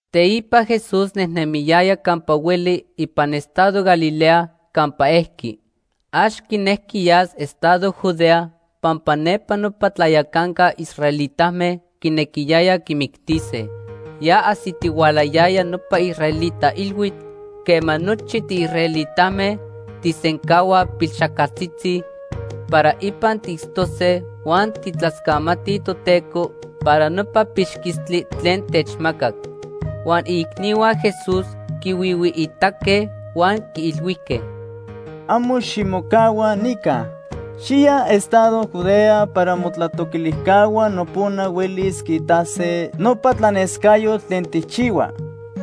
Teipa Jesús nejnemiyaya campa hueli ipan estado Galilea campa ejqui. Ax quinejqui yas estado Judea pampa nepa nopa tlayacanca israelitame quinequiyayaj quimictise. Ya ajsitihualayaya nopa israelita ilhuitl quema nochi tiisraelitame tijsencahuaj pilxajcaltzitzi para ipan tiitztose huan tijtlascamatij Toteco para nopa pixquistli tlen techmacac. Huan iicnihua Jesús quihuihuiitaque huan quiilhuijque: ―Amo ximocahua nica. Xiya estado Judea para motlatoquilijcahua nopona huelis quiitase nopa tlanescayotl tlen tijchihua.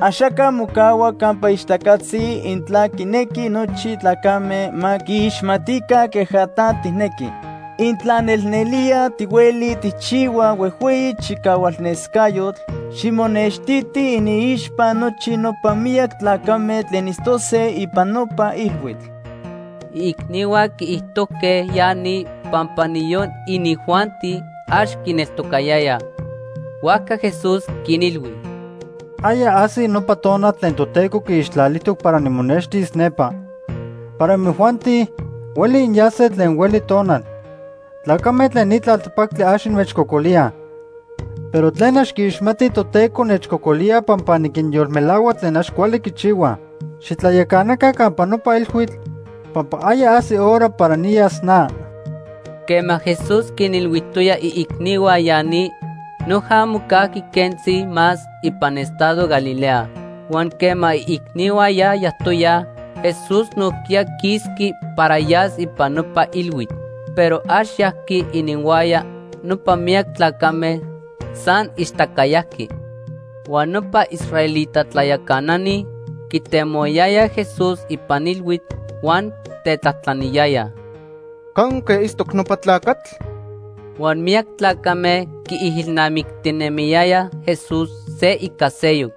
Axaca mocahua campa ixtacatzi intla quinequi nochi tlacame ma quiixmatica queja ta tijnequi. Intla nelnelía tihueli tijchihua huejhueyi chicahualnescayotl, ximonextiti iniixpa nochi nopa miyac tlacame tlen itztose ipan nopa ilhuitl. Iicnihua quiijtojque ya ni pampa niyon inijuanti, ax quineltocayayaj. Huajca Jesús quinilhui: ―Aya ajsi nopa tonal tlen Toteco quiixtlalijtoc para nimonextiti nepa. Para imojuanti, hueli inyase tlen hueli tonal. Tlacame tlen ni tlaltepactli ax inmechcocolíaj. Pero tlen ax quiixmatij Toteco nechcocolíaj pampa niquinyolmelahua tlen ax cuali quichihuaj. Xitlayacanaca campa nopa ilhuitl pampa aya ajsi hora para niyas na. Quema Jesús quinilhuijtoya iicnihua ya ni, noja mocajqui quentzi más ipan estado Galilea. Huan quema iicnihua ya yajtoyaj, Jesús nojquiya quisqui para yas ipan nopa ilhuitl. Pero ax yajqui ininhuaya nopa miyac tlacame, san ixtaca yajqui. Huan nopa israelita tlayacanani quitemohuayayaj Jesús ipan ilhuitl huan tetlajtlaniyayaj: ―¿Canque itztoc nopa tlacatl? Huan miyac tlacame quiijilnamictinemiyayaj Jesús se ica seyoc.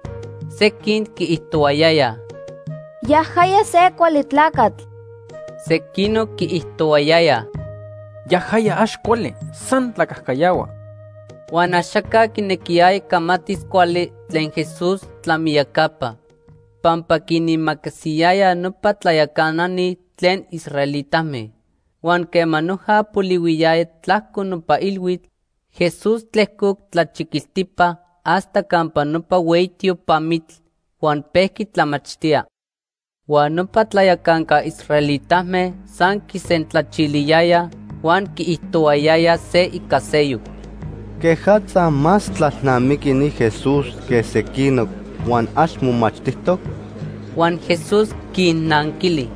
Sequin quiijtohuayayaj: “Yajaya se cuali tlacatl.” Sequinoc quiijtohuayayaj: “Yajaya ax cuali, san tlacajcayahua.” Huan axaca quinequiyaya camatis cuali tlen Jesús tlamiyacapa, pampa quinimacasiyayaj nopa tlayacanani tlen israelitame. Huan quema noja polihuiyaya tlajco nopa ilhuitl, Jesús tlejcoc tlachiquiltipa hasta campa nopa hueyi tiopamitl huan pejqui tlamachtía. Huan nopa tlayacanca israelitame san quisentlachiliyayaj huan quiijtohuayayaj se ica seyoc: ―¿Quejatza más tlalnamiqui ni Jesús que sequinoc huan ax momachtijtoc? Huan Jesús quinnanquili: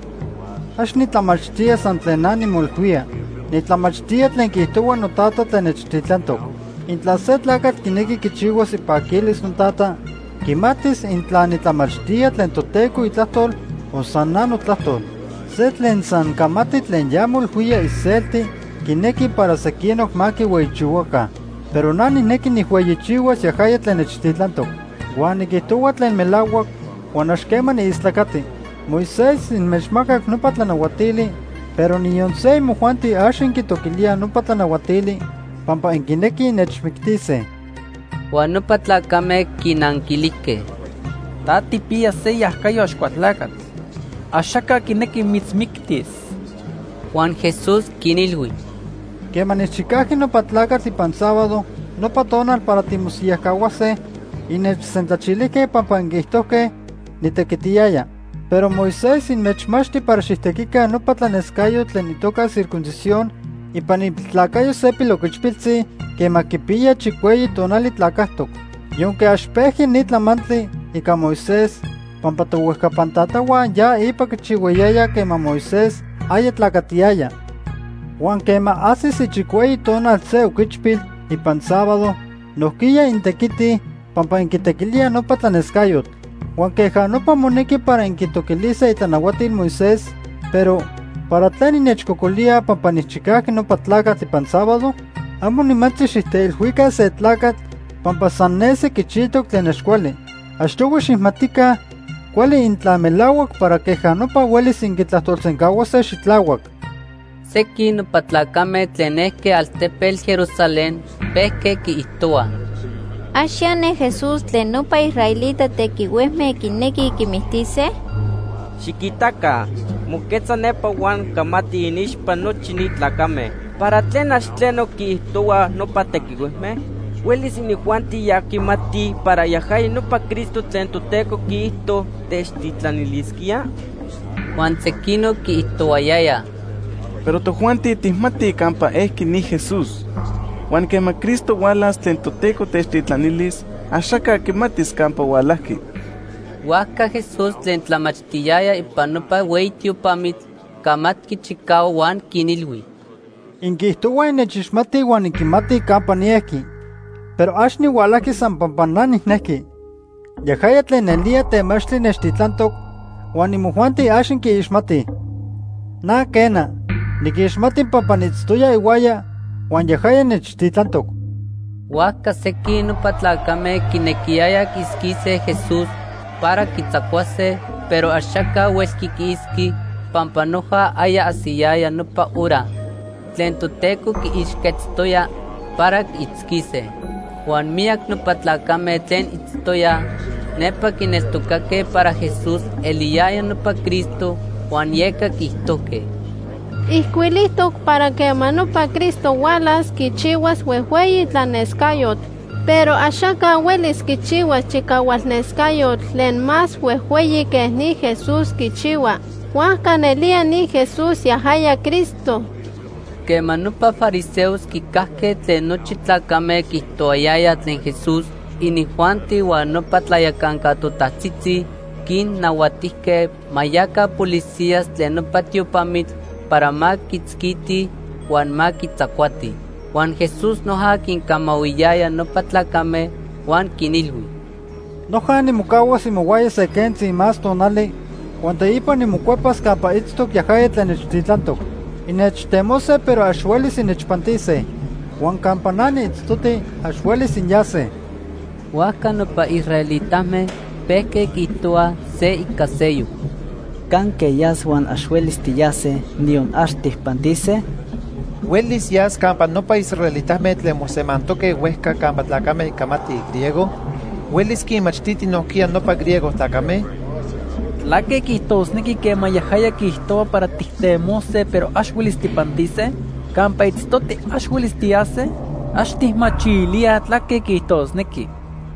―Ax nitlamachtía san tlen na nimoilhuía. Nitlamachtía tlen quiijtohua noTata tlen nechtitlantoc. Intla se tlacatl quinequi quichihuas ipaquilis noTata, quimatis intla nitlamachtía tlen Toteco itlajtol o san na notlajtol. Se tlen san camati tlen ya moilhuía iselti quinequi para sequinoc ma quihueyichihuaca. Pero na nijnequi nijhueyichihuas yajaya tlen nechtitlantoc. Huan niquijtohua tlen melahuac huan ax quema niistlacati. “Moisés inmechmacac nopa tlanahuatili, pero niyon se imojuanti ax inquitoquilíaj nopa tlanahuatili pampa inquinequij innechmictise.” Huan nopa tlacame quinanquilijque: ―Ta tijpiya se iajacayo Axcualtlacatl. Axaca quinequi mitzmictis. Huan Jesús quinilhui: ―Quema nijchicajqui nopa tlacatl ipan sábado nopa tonal para timosiyajcahuase, innechsentlachilijque pampa inquiijtojque nitequitiyaya. Pero Moisés inmechmachti para xijtequica nopa tlanescayotl tlen itoca circuncisión ipan ipiltlacayo se piloquichpiltzi quema quipiya chicueyi tonali tlacajtoc. (Yonque ax pejqui ni tlamantli ica Moisés pampa tohuejcapan tatahua ya ipa quichihuayayaj quema Moisés aya tlacatiyaya.) Huan quema ajsis ichicueyi tonal se oquichpil ipan sábado, nojquiya intequitij pampa inquitequilíaj nopa tlanescayotl. Huan queja nopa monequi para inquitoquilise itlanahuatil Moisés, pero ¿para tlen innechcocolíaj pampa nijchicajqui nopa tlacatl ipan sábado? Amo nimantzi xijteilhuica se tlacatl pampa san nesi quichijtoc tlen ax cuali. Achtohui xijmatica cuali intla melahuac para queja nopa huelis inquitlajtolsencahuase xitlahuac. Sequin nopa tlacame tlen ejque altepetl Jerusalén pejque quiijtohuaj: ―¿Ax ya ne Jesús tlen nopa israelita tequihuejme quinequij quimictise? Xiquitaca, moquetza nepa huan camati iniixpa nochi ni tlacame. ¿Para tlen ax tleno quiijtohuaj nopa tequihuejme? ¿Huelis inijuanti ya quimatij para yajaya nopa Cristo tlen Toteco quiijto techtitlanilisquía? Huan sequinoc quiijtohuayayaj: ―Pero tojuanti tijmatij campa ejqui ni Jesús. Huan quema Cristo hualas tlen Toteco techtitlanilis, axaca quimatis campa hualajqui. Huajca Jesús tlen tlamachtiyaya ipan nopa hueyi tiopamitl camatqui chicahuac huan quinilhui: ―Inquiijtohuaj innechixmatij huan inquimatij campa niejqui. Pero ax nihualajqui san pampa na nijnejqui. Yajaya tlen nelía temachtli nechtitlantoc, huan imojuanti ax inquiixmatij. Na quena, niquixmati pampa niitztoya ihuaya huan yajaya nechtitlantoc. Huajca sequin nopa tlacame quinequiyayaj quiitzquise Jesús para quitzacuase, pero axaca huelqui quiitzqui pampa noja aya ajsiyaya nopa hora tlen Toteco quiixquetztoya para quiitzquise. Huan miyac nopa tlacame tlen itztoyaj nepa quineltocaque para Jesús eliyaya nopa Cristo huan yeca quiijtojque: ―Ijcuilijtoc para quema nopa Cristo hualas quichihuas huejhueyi tlanescayotl. Pero axaca huelis quichihuas chicahualnescayotl tlen más huejhueyi que ni Jesús quichihua. Huajca nelía ni Jesús yajaya Cristo. Quema nopa fariseos quicajque tlen nochi tlacame quiijtohuayayaj tlen Jesús, inijuanti huan nopa tlayacanca totajtzitzi quinnahuatijque ma yaca policías tlen nopa tiopamitl para ma quiitzquitij huan ma quitzacuatij. Huan Jesús noja quincamahuiyaya nopa tlacame huan quinilhui: ―Noja nimocahuas imohuaya se quentzi más tonali huan teipa nimocuepas campa itztoc yajaya tlen nechtitlantoc. Innechtemose pero ax huelis innechpantise. Huan campa na niitztoti ax huelis inyase. Huajca nopa israelitame pejque quiijtohuaj se ica seyoc: ―¿Canque yas huan ax huelis tiyase, niyon ax tijpantise? ¿Huelis yas campa nopa israelitame tlen mosemantoque huejca campa tlacame camatij griego? ¿Huelis quinmachtiti nojquiya nopa griego tlacame? ¿Tlaque quiijtosnequi quema yajaya quiijtohua para tijtemose, pero ax huelis tijpantise? ¿Campa itztoti ax huelis tiyase? Ax tijmachilíaj tlaque quiijtosnequi.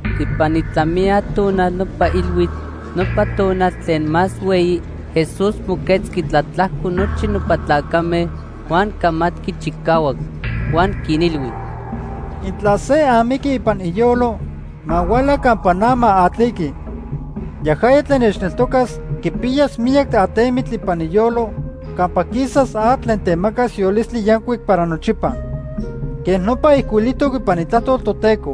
Ipan itlamiya tonal nopa ilhuitl, nopa tonal tlen más hueyi, Jesús moquetzqui tlatlajco nochi nopa tlacame huan camatqui chicahuac. Huan quinilhui: ―Intla se amiqui ipan iyolo, ma huala campa na ma atliqui. Yajaya tlen nechneltocas quipiyas miyac atemitl ipan iyolo campa quisas atl tlen temacas yolistli yancuic para nochipa. Quej nopa ijcuilijtoc ipan Itlajtol Toteco.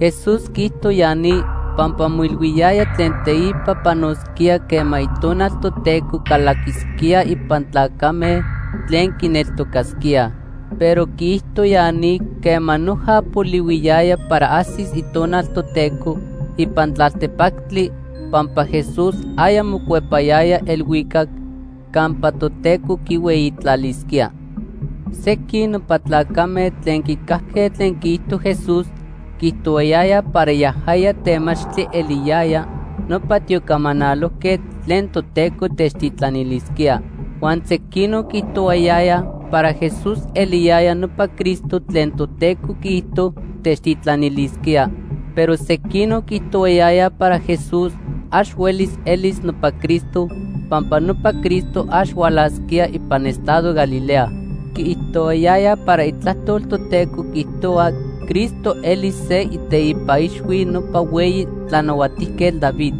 Jesús quiijto ya ni pampa moilhuiyaya tlen teipa panosquía quema Itonal Toteco calaquisquía ipan tlacame tlen quineltocasquíaj. Pero quiijto ya ni quema noja polihuiyaya para ajsis Itonal Toteco ipan tlaltepactli pampa Jesús aya mocuepayaya elhuicac campa Toteco quihueyitlalisquía. Sequin nopa tlacame tlen quicajque tlen quiijto Jesús quiijtohuayayaj para yajaya temachtli eliyaya nopa tiocamanalojquetl tlen Toteco techtitlanilisquía. Huan sequinoc quiijtohuayayaj para Jesús eliyaya nopa Cristo tlen Toteco quiijto techtitlanilisquía. Pero sequinoc quiijtohuayayaj para Jesús ax huelis elis nopa Cristo pampa nopa Cristo ax hualasquía ipan estado Galilea. Quiijtohuayayaj para Itlajtol Toteco quiijtohua Cristo elis se iteipa ixhui nopa hueyi tlanahuatijquetl David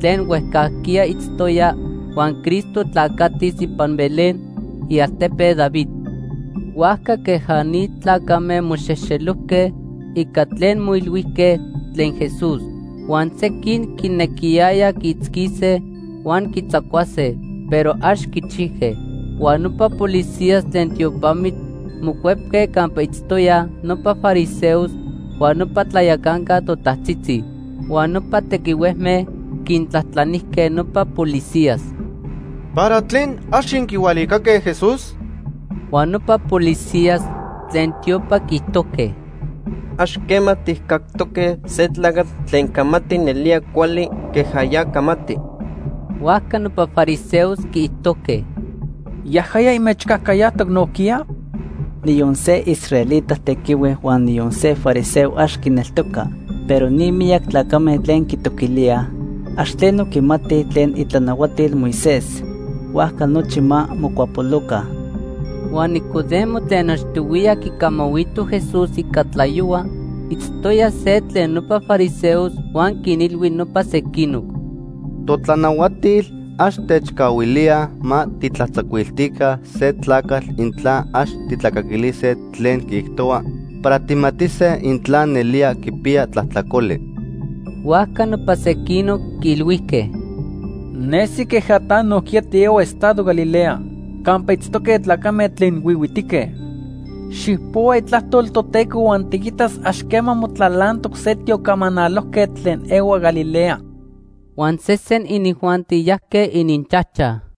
tlen huejcajquiya itztoya huan Cristo tlacatis ipan Belén, ialtepe David. Huajca queja ni tlacame moxejxelojque ica tlen moilhuijque tlen Jesús. Huan sequin quinequiyayaj quiitzquise huan quitzacuase, pero ax quichijque. Huan nopa policías tlen tiopamitl mocuepque campa itztoyaj nopa fariseos huan nopa tlayacanca totajtzitzi. Huan nopa tequihuejme quintlajtlanijque nopa policías: ―¿Para tlen ax inquihualicaque Jesús? Huan nopa policías tlen tiopa quiijtojque: ―Ax quema tijcactoque se tlacatl tlen camati nelía cuali queja ya camati. Huajca nopa fariseos quiijtojque: ―¿Yajaya inmechcajcayajtoc nojquiya? Niyon se israelita tequihue huan niyon se fariseo ax quineltoca. Pero ni miyac tlacame tlen quitoquilíaj, ax tleno quimatij tlen itlanahuatil Moisés. Huajca nochi ma mocuapoloca. Huan Nicodemo tlen achtohuiya quicamahuito Jesús ica tlayohua itztoya se tlen nopa fariseos huan quinilhui nopa sequinoc: ―Totlanahuatil ax techcahuilíaj ma tijtlatzacuiltica se tlacatl intla ax tijtlacaquilise tlen quiijtohua para tijmatise intla nelía quipiya tlajtlacoli. Huajca nopa sequinoc quiilhuijque: ―Nesi queja ta nojquiya tiehua estado Galilea campa itztoque tlacame tlen huihuitique. Xijpohua Itlajtol Toteco huan tiquitas ax quema motlalantoc se tiocamanalojquetl tlen ehua Galilea. Huan sesen inijuanti yajque ininchajchaj.